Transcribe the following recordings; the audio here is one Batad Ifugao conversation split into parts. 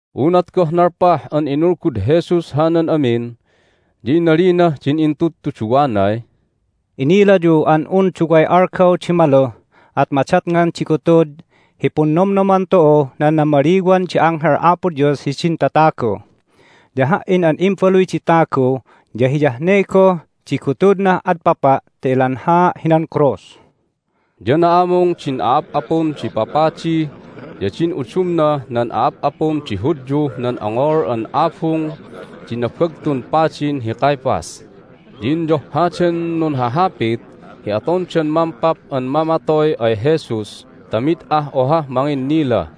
Unat goh nalpah an inulgud Jesus hanan amin ya inalinah din intudtuduwanay, "Inilayu an un duway algaw di maluh at madatngan di gutud hi Punnomnoman tu'uh nan Namaliwan di Anghel Apo Dios hidin Tatagu, ya Ha"in an Imbaluy di Tagu ya hiyah ne goh di gutudnah adpapa' ta ilanhaa' hinan krus." Ya na'amung din a'ap'apun di papadi ya din udumnah nan a'ap'apun di Hudyuh nan ongol an abung di Nabagtun Padin hi Caiaphas, ya inyohhadan nunhahapit hi atondan mampap an mamatoy ay Jesus ta mid ah ohah manginnila.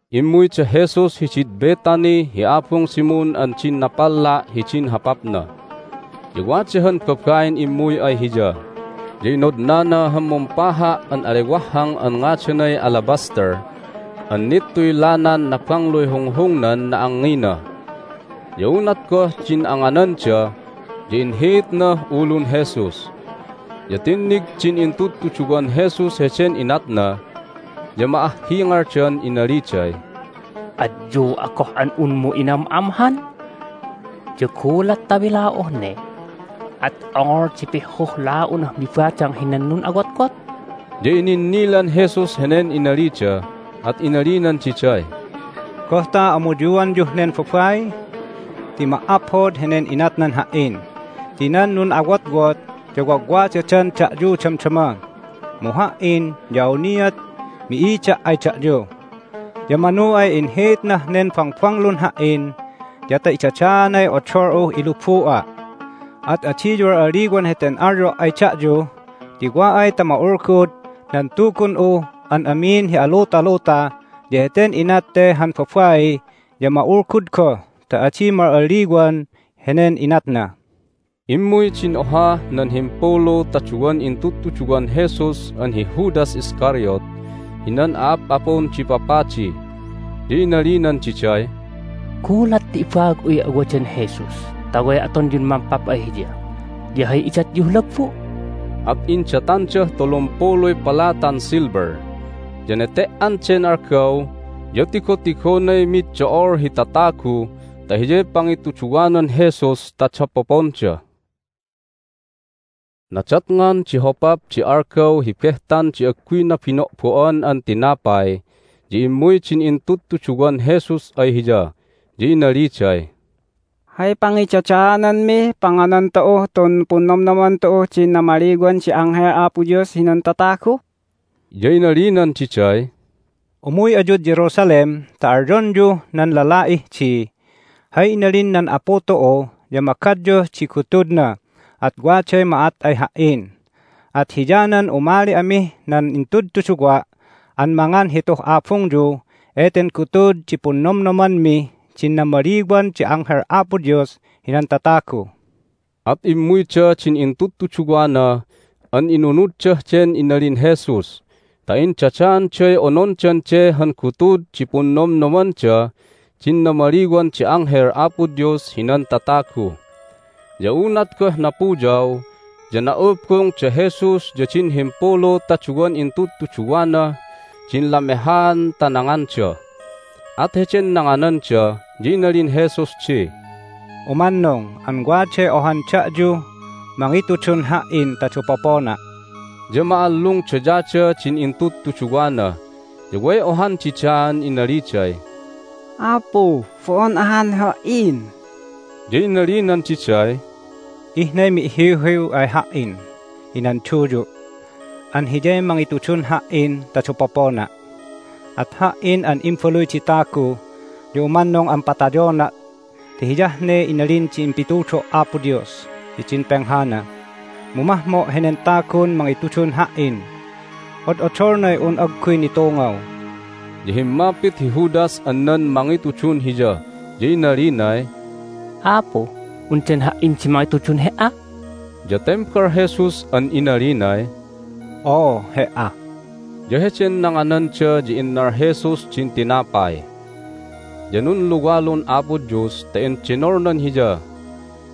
Immuy da Jesus hidid Bethany hi abung Simon an din napalla' hidin hopapna. Ya wada han babain immuy ay Hiya, ya inodnana han mumpaha' an alewahhang an ngadanay alabaster an nittuy lanan nabangluy hunghungnan na'angngina. Ya unat goh din angananda ya inhiitnah ulun Jesus. Ya tinnig din intudtuduwan Jesus heden inatna, ya ma'ahhingaldan inaliday, "Adyu'a goh an unmu inam'amhan! Ya gulat ta mila'uh ne at ongol di pihhuh la'unah mibadang hinan nun'awotwot!" Ya ininnilan Jesus henen inalida, at inalinan diday, "Goh ta amuyuanyuh nen babai? Ti ma"aphod henen inatnan Ha"in ti nan nun'awotwot ya wagwadadan da'yu damdama, mu Ha"in ya awniat mi'ida' ay da'yu. Ya manu ay inhiitnah nen bangbanglun Ha"in ya ta idadaanay odol'uh ilubu'a'. At adiyu al'alliwan heten alyo' ay da'yu, ti wa ay ta ma'ulgud nan Tugun'uh an amin hi alutaluta ya heten inat te han babai ya ma'ulgud goh ta adi ma'aliwan henen inatna." Immuy din ohah nan himpulu ta duwan intudtuduwan Jesus an hi Judas Iscariot hinan a'ap'apun di papadi, ya inalinan diday, "Gulat ta ibaag'uy awadan Jesus ta way atonyun mampap ay Hiya ya hay idatyuh lagbu'?" At indatandah tulumpuluy palatan silver. Ya nete"an den algaw ya tigotigonay mid do'ol hi tatagu ta hiyay pangituduwanan Jesus ta dapoponda. Hay Ne"anan Jesus hidin Intudtuduwana Nadatngan di hopap di algaw hi Behtan di Agguy Nabino'bo'an an Tinapay ya immuy din intudtuduwan Jesus ay Hiya, ya inaliday, "Hay pangidadaananmih panganan tu'uh tun Punnomnoman tu'uh din Namaliwan di Anghel Apo Dios hinan Tatagu?" Ya inalinan diday, "Umuy ayud Jerusalem ta alyonyuh nan lala'ih di, Hay inalin nan Apu tu'u ya magadyuh di gutudna, at waday ma'at ay Ha"in. At hiyanan umali amih nan intudtuduwa' an mangan hituh abungyu eten gutud di Punnomnomanmih din Namaliwan di Anghel Apo Dios hinan Tatagu." At immuyda din intudtuduwana an inunuddah den inalin Jesus ta indadaanday onondan de han gutud di Punnomnomandah din Namaliwan di Anghel Apo Dios hinan Tatagu. Ya unat goh napuyaw ya na'ubung da Jesus ya din himpulu ta duwan intudtuduwanah din lamehaan ta nanganda. At heden nangananda ya inalin Jesus di, "Umannung an waday ohan da'yuh mangitudun Ha"in ta dapopona'." Ya ma'allungdayada din intudtuduwana, ya way ohan didaan inaliday, "Apu, bo'on ahan ha"in!" Ya inalinan diday, "Ihnay mi'hiwhiw ay Ha"in hinan duyu' an hiyay mangitudun Ha"in ta dapopona'. At Ha"in an Imbaluy di Tagu ya umannung an patayona' ti hiyah ne inalin din impitudo' Apo Dios hidin penghana. Mu mahmo' henen tagun mangitudun Ha"in! Od'odolnay un agguy nitungaw!" Ya himmapit hi Judas an nan mangitudun Hiya, ya inalinay, "Apu, undan ha"in di mangitudun He"a?" Ya tembal Jesus an inalinay, "Oo, he"a." Ya heden nangananda ya innal Jesus din tinapay, ya nunluwalun Apo Dios ta endenolnan Hiya,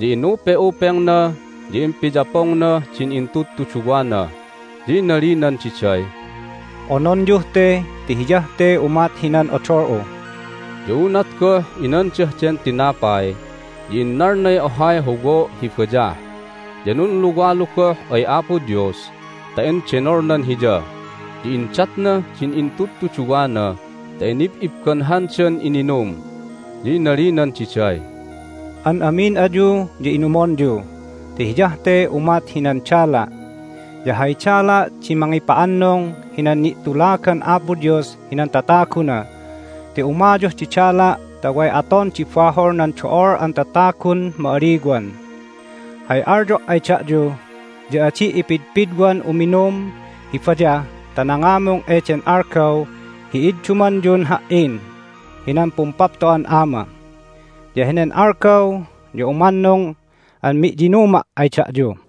ya inupe'upengna, ya impiyapongnah din intudtuduwana, ya inalinan diday, "Ononyuh te ti hiyah te umat hinan odol'u." Ya unat goh inandah den tinapay ya innalnay ohay howo' hi bayah, ya nunluwalu goh ay Apo Dios ta endenolnan Hiya, ya indatnah din intudtuduwana ta inib'ibbanhandan ininum. Ya inalinan diday, "An amin ayu ya inumonyu ti hiyah te umat hinan dala', ya hay dala' di mangipa'annung hinan ni'tulagan Apo Dios hinan tataguna ti umayuh di dala' ta way aton di bahol nan do'ol an tatagun ma'aliwan. Hay alyo' ay da'yu ya adi' ipidpidwan uminum hi bayah ta nangamung eden algaw hi iddumanyun Ha"in hinan Pumpapto'an Ama, ya henen algaw ya umannung an mi'yinuma' ay da'yu."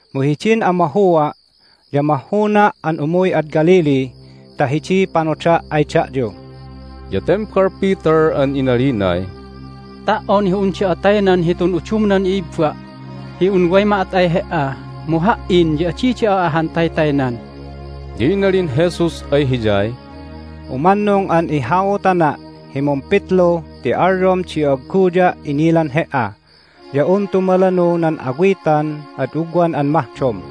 Mu hidin amahua' ya mahhuna' an umuy ad Galilee ta hidiy panoda' ay da'yu." Ya tembal Peter an inalinay, "Ta"on hi un da'a taynan hitun udumnan i'ibba' hi un way ma'at ay He"a mu ha"in ya adi da'a ahan taytaynan!" Ya inalin Jesus ay hiyay, "Umannung an ihautana' hi mumpitlu ti alyom di agguya' inilan he"a ya un tumalanu nan awitan ad ugwan an mahdom."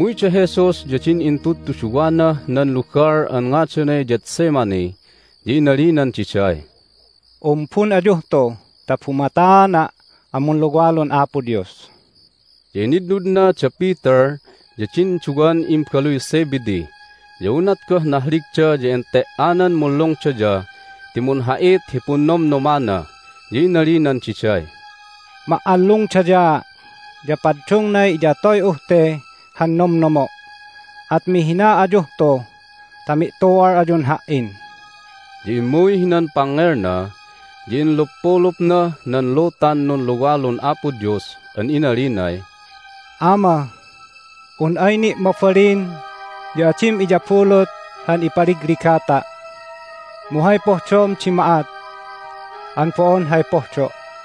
Immuy da Jesus ya din intudtuduwanah nan lugal an ngadanay Gethsemane, ya inalinan diday, "Umbun ayuh tu ta bumataana' an munluwalun Apo Dios." Ya initnudna da Peter ya din duwan imbaluy Zebedee. Ya unat goh nahligda ya ente"anan munlungdaya ti munha'it hi punnomnomana. Ya inalinan diday, "Ma'allungdayaa', ya paddungnay iyatoy'uh te han nomnomo', at mihina ayuh tu ta mi'tu'al ayun Ha"in." Ya immuy hinan pangngelna, ya inluppulupnah nan lutan nunluwalun Apo Dios an inalinay, "Ama, un ay ni' mabalin ya adim iyabulut han ipaligligata'. Mu hay pohdom di ma'at an bo'on hay pohdo'."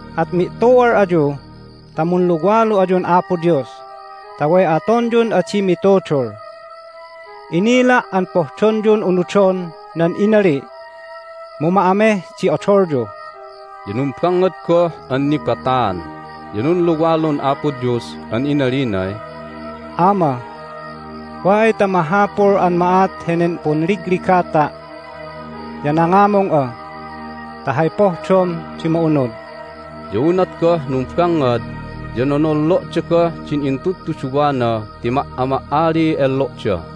At mi'tu'al ayu ta munluwalu ayun Apo Dios ta way atonyun adi mitudul! Inila' an pohdonyun unudon nan inali', mu ma'ameh di odolyu." Ya numbangngad goh an nibataan, ya nunluwalun Apo Dios an inalinay, "Ama, wa ay ta mahapul an ma'at henen punligligata' ya nangamung'a ta hay pohdom di ma'unud." Ya unat goh numbangngad ya nonollo'da goh din intudtuduwana ti ma"ama"aliy enlo'da.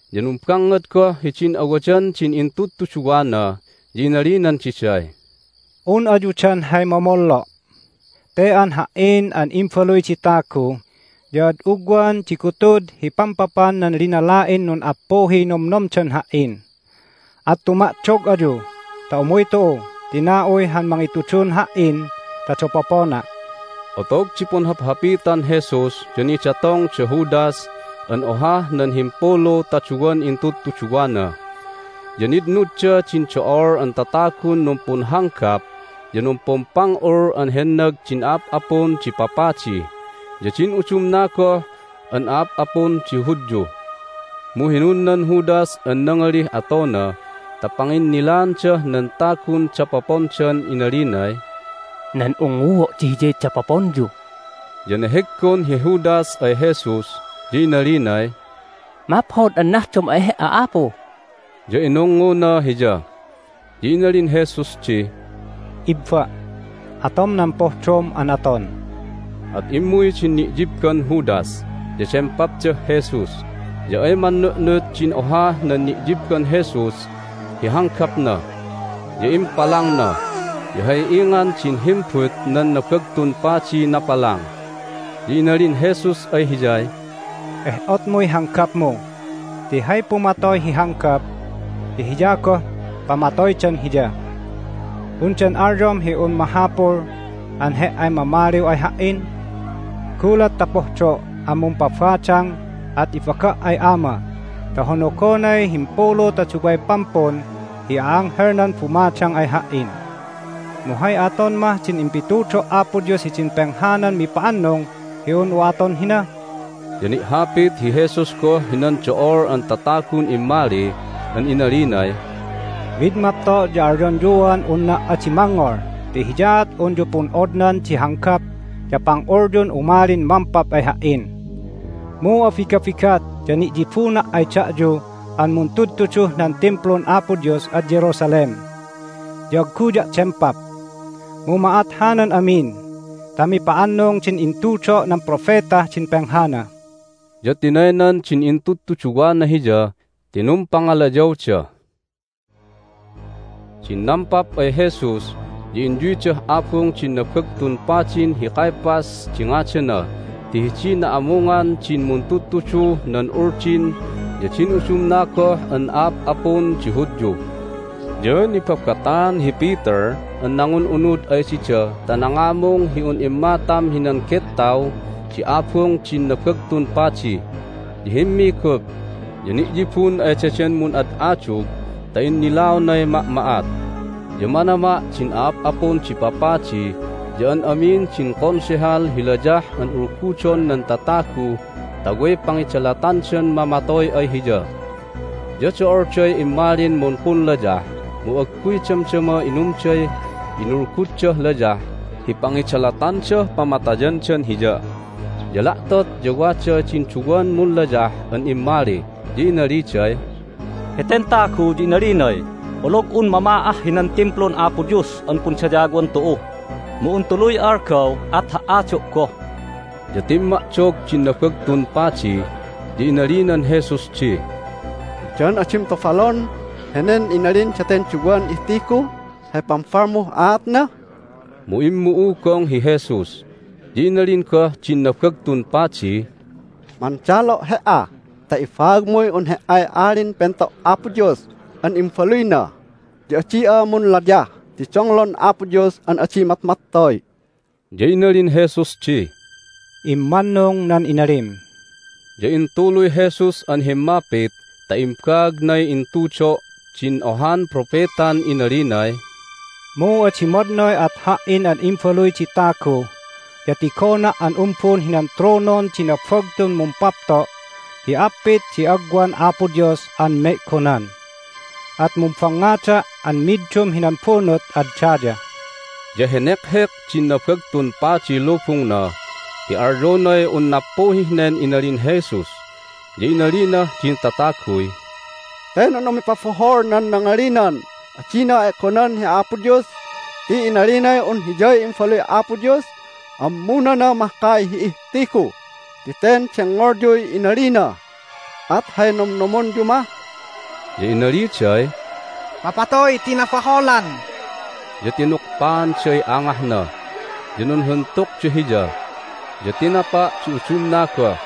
Ya numbangngad goh hidin awadan din intudtuduwana, ya inalinan diday, "Un ayu dan hay momollo'? Te an Ha"in an Imbaluy di Tagu ya ad ugwan di gutud hi pampapan nan linala'in nun'appuhiy nomnomdan Ha"in. At tuma'dog ayu ta umuy tu'u ti na'uy han mangitudun Ha"in ta dapopona'." Hay Nampapandan Jesus Otog di punhaphapitan Jesus ya nidatong da Judas an ohah nan himpulu ta duwan intudtuduwana. Ya nitnudda din do'ol an tatagun numpunhanggap ya numpumpang'ul an hennag din a'ap'apun di papadi ya din udumna goh an a'ap'apun di Hudyu. Mu hinunnan Judas an nangalih atona ta panginnilaandah nan tagun dapopondan inalinay, "Nan ungnguo' di Hiyay dapoponyu." Ya neheggon hi Judas ay Jesus, ya inalinay, "Maphod an nahdom ay He"a, Apu!" Ya inungnguna Hiya. Ya inalin Jesus di, "Ibba', atom nan pohdom an aton." At immuy din ni'yibban Judas, ya dempapdah Jesus. Ya ay mannu'nut din ohah nan ni'yibban Jesus hi hanggapna, ya impalangna, ya hay ingan din himbut nan Nabagtun Padiy napalang. Ya inalin Jesus ay hiyay, "Eh'otmuy hanggapmu ti hay pumatoy hi hanggap ya hiya goh pamatoydan hiya. Undan alyom hi un mahapul an he"ay mamaliw ay Ha"in? Gulat ta pohdo' an mumpabadang at ibaga' ay Ama ta honogonay himpulu ta duway pampun hi a'anghelnan bumadang ay Ha"in. Mu hay aton mah din impitudo' Apo Dios hidin penghanan mipa'annung hi un'u aton hina?" Ya ni'hapit hi Jesus goh hinan do'ol an tatagun immali an inalinay, "Mid mapto' ya alyonyuan unna' adi mangngol ti hiyaat unyu pun'odnan di hanggap ya pang'ulyun umalin mampap ay Ha"in. Mu abigabigat ya ni'yibuna' ay da'yu an muntudtuduh nan Timplun Apo Dios ad Jerusalem, ya agguya' dempap. Mu ma'at hanan amin ta mipa'annung din intudo' nan propetah din penghana." Ya tinaynan din intudtuduwana Hiya ti numpangalayawda. Hay Nanumalyaan nan Konsehal Jesus Din nampap ay Jesus ya inyuydah abung din Nabagtun Padin hi Caiaphas di ngadana ti hidiy na'amungan din muntudtuduh nan Uldin ya din udumna goh an a'ap'apun di Hudyu. Ya nibabataan hi Peter an nangun'unud ay dida ta nangamung hi un immatam hinan gettaw di abung din Nabagtun Padi, ya himmigup, ya ni'yibun ay daden mun'ad'adug ta innilaonay ma'ma'at. Ya manama' din a'ap'apun di papadi ya an amin din Konsehal hi layah an ulgudon nan tatagu ta way pangidalatandan mamatoy ay Hiya. Ya do'olday immalin mumpunlayah, mu agguy damdama inumday inulguddah layah hi pangidalatandah pamatayandan Hiya. Ya la'tot ya wa din duwan munlayah an immali, ya inaliday, "Heten tagu ya inalinay, Olog'un mama'ah hinan Timplun Apo Dios an pundayawan tu'u, mu un tuluy algaw at ha"ado' goh." Ya timma'dog din Nabagtun Padi, ya inalinan Jesus di, "Undan adim tobalon henen inalin daten duwan ihtigu? Hay pambalmuh aatna?" Mu immu'ugong hi Jesus. Ya inalin goh din Nabagtun Padiy, "Mandalo' He"a ta ibaagmuy un He"ay Alin Pento' Apo Dios an Imbaluyna, ya adi'a munlayah ti donglon Apo Dios an adi matmattoy." Ya inalin Jesus di, "Immannung nan inalim." Ya intuluy Jesus an himmapit ta imbaagnay intudo' din ohan propetan inalinay, "Mu adi madnoy at Ha"in an Imbaluy di Tagu ya tigona' an umbun hinan tronon di nabagtun mumpapto' hi appit di agwan Apo Dios an me'gonan, at mumbangngada' an middum hinan bunut ad daya." Ya henekhek din Nabagtun Padiy lubungna ti alyonay un nappuhih nen inalin Jesus. Ya inalinah din tataguy, "Ten un umipabohol nan nangalinan adina e'gonan hi Apo Dios ti inalinay un Hiyay Imbaluy Apo Dios! Ammunana mahkay hi ihtigu ti ten dengngolyuy inalina! At hay nomnomonyu mah?" Ya inaliday, "Mapatoy ti nabaholan!" Ya tinukpaanday angahna, ya nunhuntukda Hiya, ya tinapa' di udumna goh,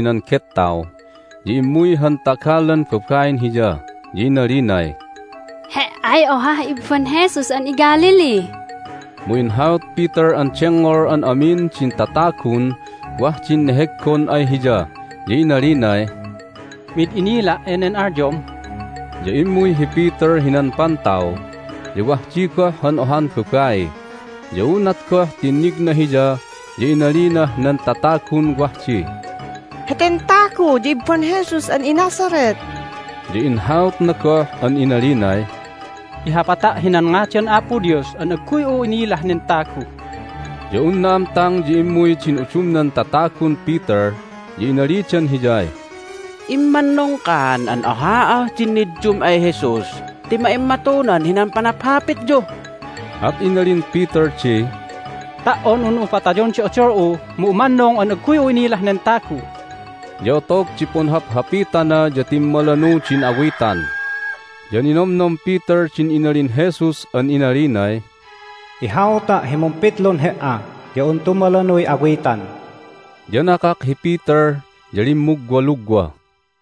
Inumbun hi Peter hinan gettaw. Ya immuy han tagalan babain hiya, ya inalinay, "He"ay ohah ibban Jesus an iGalilee!" Mu inhaut Peter an dengngol an amin din tatagun wah din neheggon ay hiya, ya inalinay, "Mid inila' enen alyom!" Ya immuy hi Peter hinan pantaw, ya wah di goh han ohan babai. Ya unat goh tinnigna hiya ya inalinah nan tatagun wah di, "Heten tagu ya ibban Jesus an iNazareth!" Ya inhautna goh an inalinay, "Ihapata' hinan ngadan Apo Dios an agguy'u inilah nen tagu!" Ya un na'amtang ya immuy din udumnan tatagun Peter, ya inalidan hiyay, "Immannung kan an oha'ah din niddum ay Jesus ti ma'immatunan hinan panaphapityu!" At inalin Peter di, "Ta"on un'u patayon di odol'u mu umannung an agguy'u innilah nen tagu!" Ya otog di punhaphapitana ya timmalanu din awitan. Ya ninomnom Peter din inalin Jesus an inalinay, "Ihauta' hi mumpitlun he"a ya un tumalanuy awitan." Ya nakak hi Peter, ya limmugwalugwa.